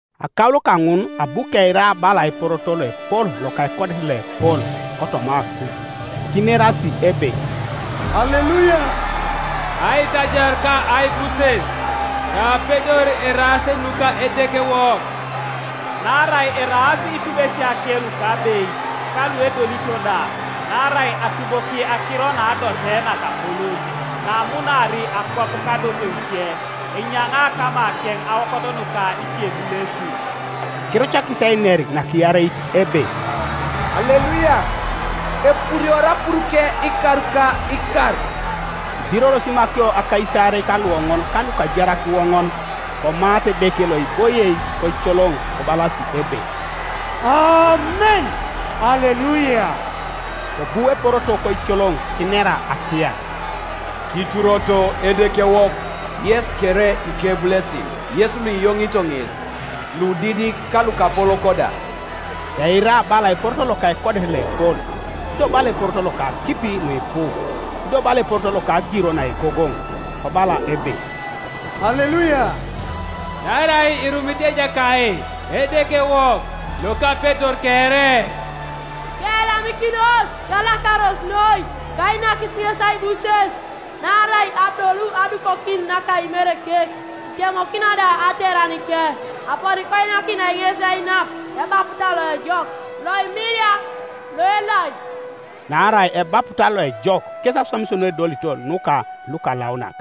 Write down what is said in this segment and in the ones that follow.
Akaulo kaŋun abu keira bala eporoto loepol loka ekodet loepol kotoma akuj, kinerasi ebe, “Aleluia! Aitajar ka aibuses, ka apedor eraas nuka Edekewok. Naarai eraas itubesiake lukabeit, ka luedolito da; Naarai atuboki akiro naadote nakapolon, Naamunaari akwap kadoteuke, Enyaŋaa kamakeŋ aokot nuka ikebulesin.” Kirucakis einer nakiareit ebe, “Aleluia! Epuriori apuruke ikar ka ikar.” Kibiroros imakio akaisaarei ka luoŋon ka lukajarak iwoŋon, komaata Edeke loiboie koicoloŋ, kobalasi ebe, “Amen. Aleluia!” Kobu eporoto koicoloŋ kinera atiar, “Kituroto Edekewok, yes kere ikebulesin, Yes luiyoŋito ŋes, ludidik ka lukapolok da.” Keira bala eporoto loka ekodet loepol, ido bala eporoto loka akipi nuipu, ido bala eporoto loka agiro naegogoŋ, kobala ebe, “Aleluia! Naarai irumit Ejakait Edekewok Lokapedor kere. Keyalamikinos, kalakaros noi, kainakis ŋes aibuses, Naarai adolu adukokin naka Imerekek, Itemokino da ateranike; Aponi koinakinai ŋes ainap ebaputa loejok, loimilia, loelai”— naarai ebaputa loejok kes aswamisio nuedolito nuka lukalaunak.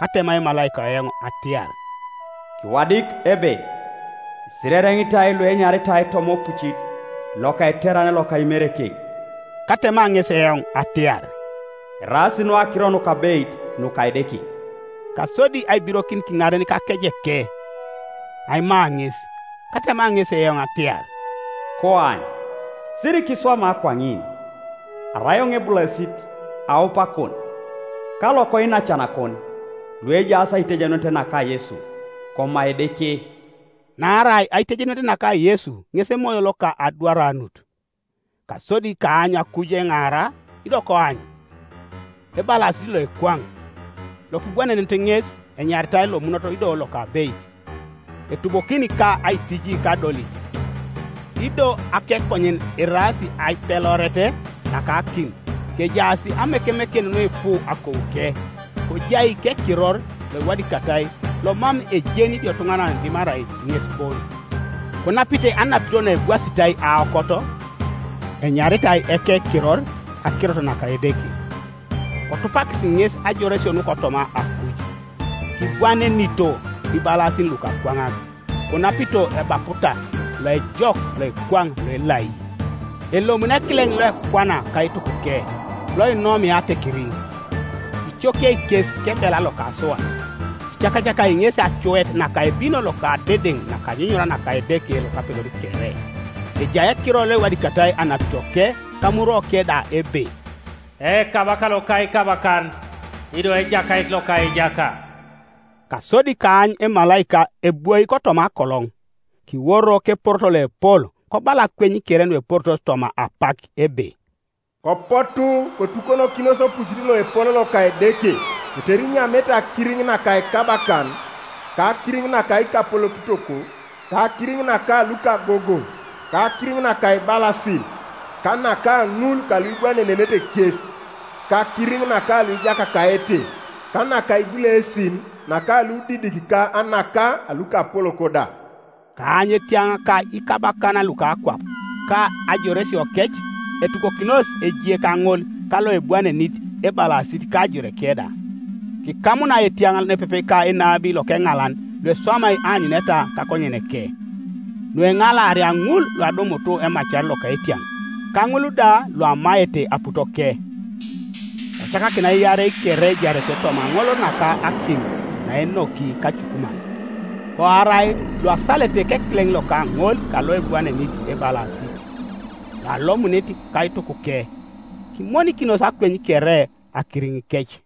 Katema emalaika eoŋ atiar, “Kiwadik ebe: Isirereŋitoi luenyaritai toma opucit loka eterane loka Imerekek.” Katema ŋesi eoŋ atiar, “Eraas nu akiro nukabeit nuka Edeke,” Kasodi aibirokin kiŋaren kakejeke, aima ŋes, Katema ŋesi eoŋ atiar, “Koany, sirikiswama kwaŋin! Arai eoŋ ebulesit aupakon, ka lokoinacanakon, luejaas kaitejenunet naka Yesu. Koma Edeke.” Naarai aitejenunet naka Yesu ŋes emoyo loka adwaranut. Kasodi kaany akuj eŋaara, ido koany, ebalasit loekwaŋ! Lokibwanenit ŋes enyaritai Lomunot ido Lokabeit, etubokini ka aitiji kadolit. Ido akekonyen eraas aipeloret naka akim, kejaas amekemeken nuipu akouke; kojai kekiror loiwadikatai lomam ejeni idiotuŋanan dimarai ŋes bon. Konapite anapito naebwasitai aokot; enyaritai ekekiror Akirot naka Edeke. Kotupakis ŋes ajoresio nukotoma akuj, kibwanenito ibalasin lukakwaŋak, konapito ebaputa loejok, loekwaŋ, loelai. Elomuni ekileŋ loekwana kaitukuke, loinomia atekerin, icokiei kes kebela loka asuat; icakacakai ŋesi acuet naka ebino loka adedeŋ naka anyunyura naka Edeke Lokapedor kere. Ejai ekiror loiwadikatai anapitoke kamurwoke da ebe, EKABAKA LOKA IKABAKAN, IDO EJAKAIT LOKA IJAKA. Kasodi kaany emalaika ebwoi kotoma akoloŋ, kiworo keporoto loepol kobala akweny kere nueporitos toma apak ebe, “Kopotu, kotukonokinos opucit loepol loka Edeke, tetere inyamete akiriŋ naka ikabakan, ka akiriŋ naka ikapolokitok, ka akiriŋ naka lukagogoŋ, ka akiriŋ naka ibalasin, ka naka ŋul kaluibwanenete kes, ka akiriŋ naka luijakakaete, ka naka ibulesin, naka ludidik ka naka lukapolok da.” Kaany etiaŋ ka ikabakan luka akwap, ka ajoresiokec, etukokinos ejie kaŋol kaloebwanenit ebalasit ka ajoreke da. Kikamunai etiaŋ nepepe ka enabi lokeŋalan loeswamai aanyuneta kakonyeneke, nueŋalaaria ŋul luadumut emacar loka etiaŋ, ka ŋul da luamaete aputoke. Kocakakinai iarei kere ejarete toma aŋolol naka akim naenoki kacukuman. Koarai luasalete kekileŋ loka ŋol kaloebwanenit ebalasit, loalomunit kaitukuke; kimonikinos akweny kere akiriŋikec.